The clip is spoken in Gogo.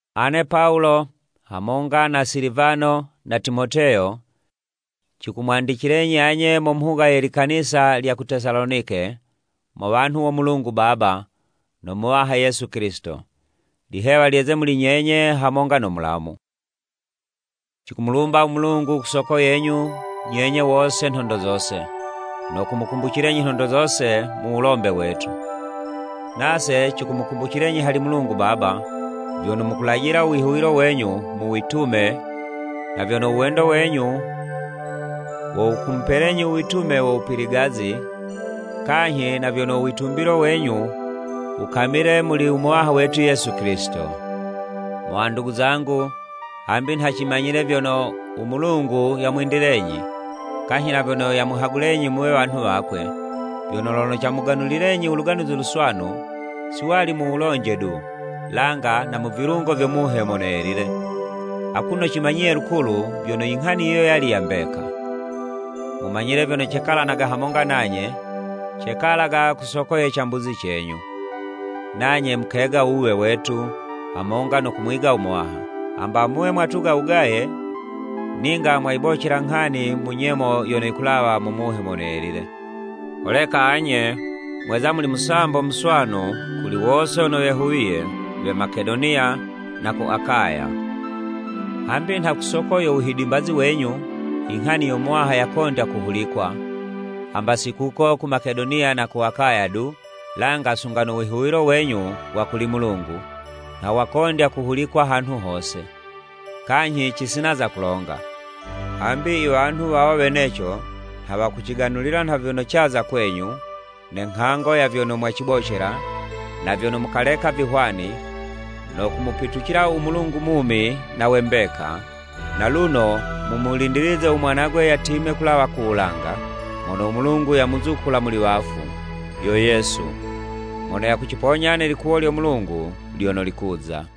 Ane Pawulo, hamonga na Silivano na Timoteyo, cikumwandicilenyi anye mo mhuga ye likanisa lya ku Tesalonike, mo wanhu wo Mulungu Baba, no Muwaha Yesu Kilisito. Lihewa lyeze muli nyenye hamonga no Mulamu. Cikumulumba u Mulungu, ku soko yenyu nyenye wose nhondo zose, no kumukumbucilenyi nhondo zose mu wulombe wetu. Nase cikumukumbucilenyi hali Mulungu Baba, vyono mukulajila u wihuwilo wenyu mu witume, na vyono u wendo wenyu wo wukumupelenyi u witume wo wupiligazi, kanyhi na vyono u witumbilo wenyu wukamile muli u Muwaha wetu Yesu Kilisito. Mo wandugu zangu, hambi nha cimanyile vyono, u Mulungu yamwendilenyi, kanyhi na vyono yamuhagulenyi muwe wanhu wakwe, vyono lono camuganulilenyi u Luganuzi Luswanu, si wali mu wulonje du, langa na mu vilungo vyo Muhe Mono Yelile, akuno cimanyiye lukulu, vyono, i nghani yiyo yali ya mbeka. Mumanyile vyono cekalanaga hamonga nanye, cekalaga ku soko ye cambuzi cenyu. Nanye mukega u wuwe wetu, hamonga no kumwiga u Muwaha. Hamba muwe mwatuga wugaye, ninga mwayibocela nghani mu nyemo yono yikulawa mu Muhe Mono Yelile. Holeka anye mweza muli musambo muswanu kuli wose wono wehuwiye we Makedoniya na ku Akaya. Hambi nha ku soko yo wuhidimbazi wenyu, i nghani yo Muwaha yakondya kuhulikwa, hamba si kuko ku Makedoniya na ku Akaya du, langa sunga no wihuwilo wenyu wa kuli Mulungu, nha wakondya kuhulikwa hanhu hose. Kanyhi cisina za kulonga. Hambi i wanhu wawo weneco nha wakuciganulila nha vyono caza kwenyu, ne nghango ya vyono mwacibocela, na vyono mukaleka vihwani, no kumupitucila u Mulungu mumi na we mbeka, na luno mumulindilize u Mwanagwe yatime kulawa ku wulanga, mono u Mulungu yamuzukula muli wafu, yo Yesu, mono yakuciponya ne likuwo lyo Mulungu lyono likuza.